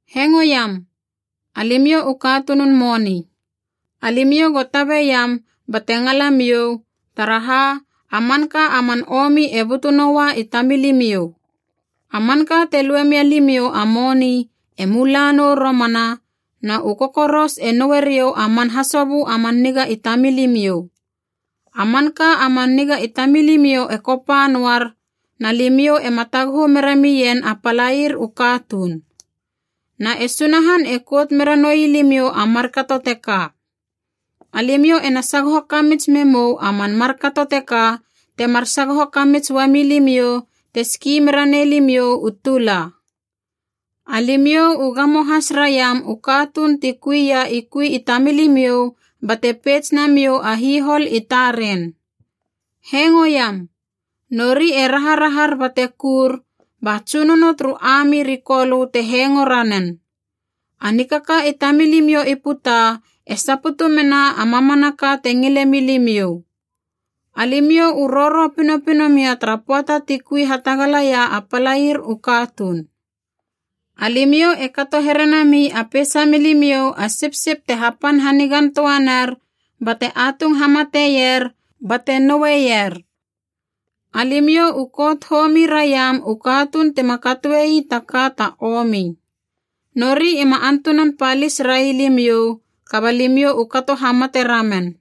Hengoiam, alimiou u katunun moni. Alimiou go tabeiam bate ngalamiou, taraha a manka a man omi e butu noua i tamilimiou. A manka te lue mialimiou a moni e mula nou romana, na u kokoros e noue riou a man hasobö a man niga i tamilimiou. A manka a man niga i tamilimiou e kopa noar, na limiou ema taguhu mera mien a palair u katuun. Na e Sunahan e kout mera noi limiou a markato teka. Alimiou ena sagoho kamits memou a man markato teka temar sagoho kamits uami limiou te ski mera nei limiou u tula. Alimiou u gamo has raiam u katuun ti kui ia i kui i tamilimiou bate peits namiou a hihol i taren. Hengoiam! Nori e raharahar bate kur, ba Tsunono turu ami ri Kolö te hengo ranen. A nikaka i tamilimiou i puta e saputu mena a mamanaka te ngile milimiou. Alimiou u roro pinopino mia tara pöata ti kui hatagalaia a palair u katuun. Alimiou e kato here nami a peisa milimiou a sipsip te hapan hanigan töa ner bate atung hamateier bate noueier. Alimiou u kout homi raiam u katuun tima katoe ii taka ta omi. Nori ima antunan palis railimiou, kaba limiou u kato hamate ramen.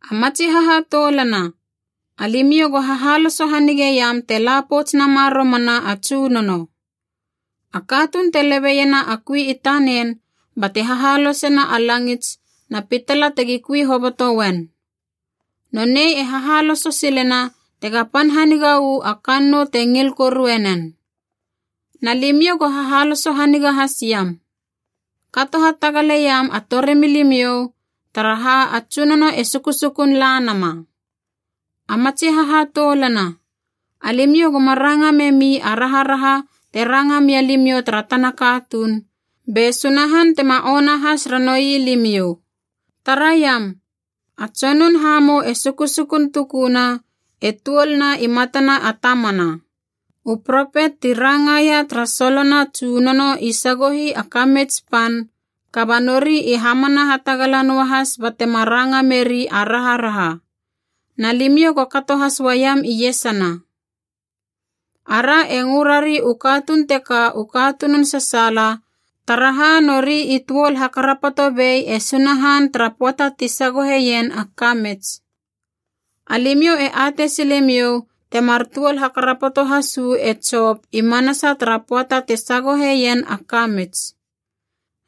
A matsi hahatoulana, alimiou go hahaloso hanigeiam te la pouts nama romana a Tsunono. A katuun e lebeiena a kui i tanen bate hahalosena a langits na pitala tegi kui hoboto uen. Nonei e hahaloso silena tega pan haniga uu a kannou te ngil korue nen. Na limiou go hahaloso haniga hasiam. Kato hatagaleiam a torimilimiou, taraha a Tsunono e sukusukun la nama. A matsi hahatoulana, alimiou goma ranga memi a raharaha te ranga mia limiou tara tana katuun, be Sunahan tema ona has ranoui limiou. Taraiam, a Tsonun Hamou e sukusukun tukuna, e tuol na i matana a tamana. U propet ti rangaia tara solona Tsunono i sagohi a kamits pan, kaba nori i hamana hatagala noahas batema ranga meri a raharaha. Na limiou go kato has uam iesana. Ara e ngö rari u katuun teka u katunun sasaala, taraha nori i tuol hakarapoto bei e Sunahan tara pöata ti sagoheien a kamits. Alimiou e atei silemiou temar tuol hakarapoto has uu e Jop i manasa tara pöata te sagoheien a kamits.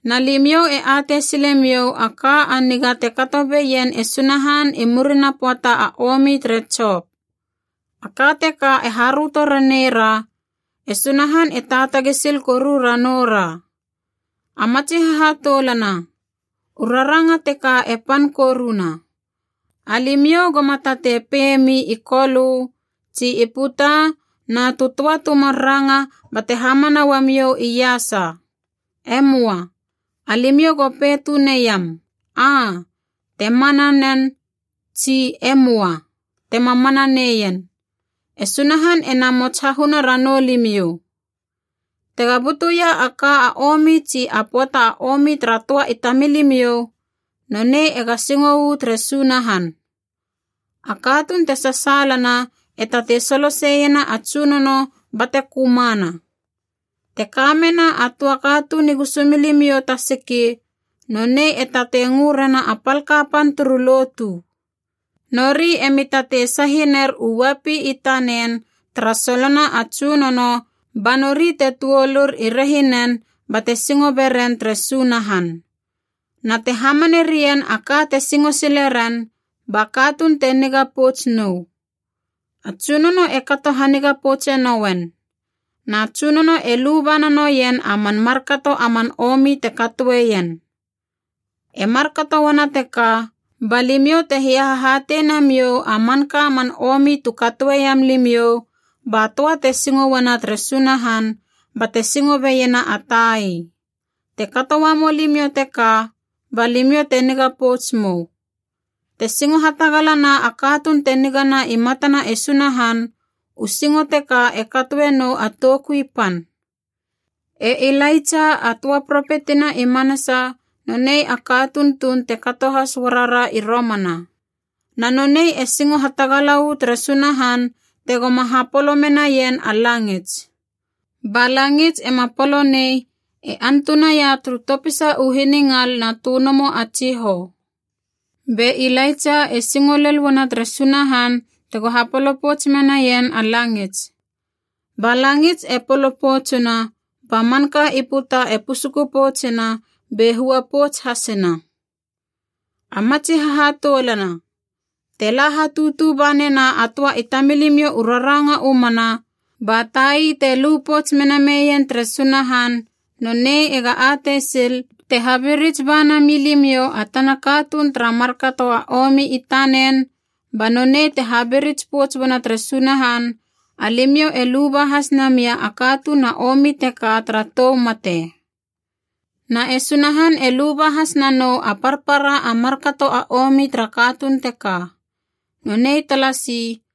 Na limiou e atei silemiou a ka a niga te kato beien e Sunahan i murina pöata a omi tere Jop. A ka teka e haröto raneira, e Sunahan e taatagi sil koru ranoura. A matsi hahatoulana, u raranga teka e pan koruna: alimiou goma tatei peiemi i Kolö tsi i puta na tu töa tu mar ranga bate hamana uamiou iasa. E möa. Alimiou go pei tuneiam “Aa” te mana nen, tsi “E möa” tema mana neien. E Sunahan ena mots hahuna ranou limiou. Tega butuia a ka a omi tsi a pöata a omi tara töa i tamilimiou, nonei ega singo uu tere Sunahan. A katuun te sasaalana e tatei soloseiena a Tsunono bate kömana. Te ka mena a töa katuun i gusumilimiou ta siki, nonei e tatei ngö rena a pal kapan turu lotu. Nori emi tatei sahi ner u uapi i tanen tara solona a Tsunono ba nori te tuolur i rehinen bate singo beren tere Sunahan. Na te hamane rien a ka te singo sile ren, ba katuun te niga pouts nou. A Tsunono e kato haniga poutse nouen. Na Tsunono e luba nanoien a man markato a man omi te katoeien. E markato uana teka, ba limiou te hiahahatei namiou a manka man omi tu katoeiam limiou, ba töa te singo uana tere Sunahan bate singo beiena a tai. Te kato uamou limiou teka, ba limiou te niga pouts mou. Te singo hatagalana a katuun te nigana i matana e Sunahan, u singo teka e katoe nou a toukui pan. E Ilaitsa a töa propetina i manasa nonei a katuun tuun te kato has uara ra i romana. Na nonei e singo hatagala uu tere Sunahan tegoma hapolo menaien a langits. Ba langits ema polo nei e antunaia turu topisa hiningal na tönomo a tsihou! Be Ilaitsa e singo lel uana tere Sunahan tego hapolo pouts menaien a langits. Ba langits e polo poutsuna, ba manka i puta e pusuku poutsuna be hua pouts hasina. A matsi hahatoulana, te la hatutu ba nena a töa i tamilimiou u raranga u mana, ba tai te lu pouts mena meien tere Sunahan, nonei ega atei sil, te habirits ba nami limiou a tana katuun tara markato a omi i tanen ba nonei te habirits pouts uana tere Sunahan, alimiou e luba has namia a katuun a omi teka tara tou mate. Na e Sunahan e luba has nanou a parpara a markato a omi tara katuun teka. Nonei talasi.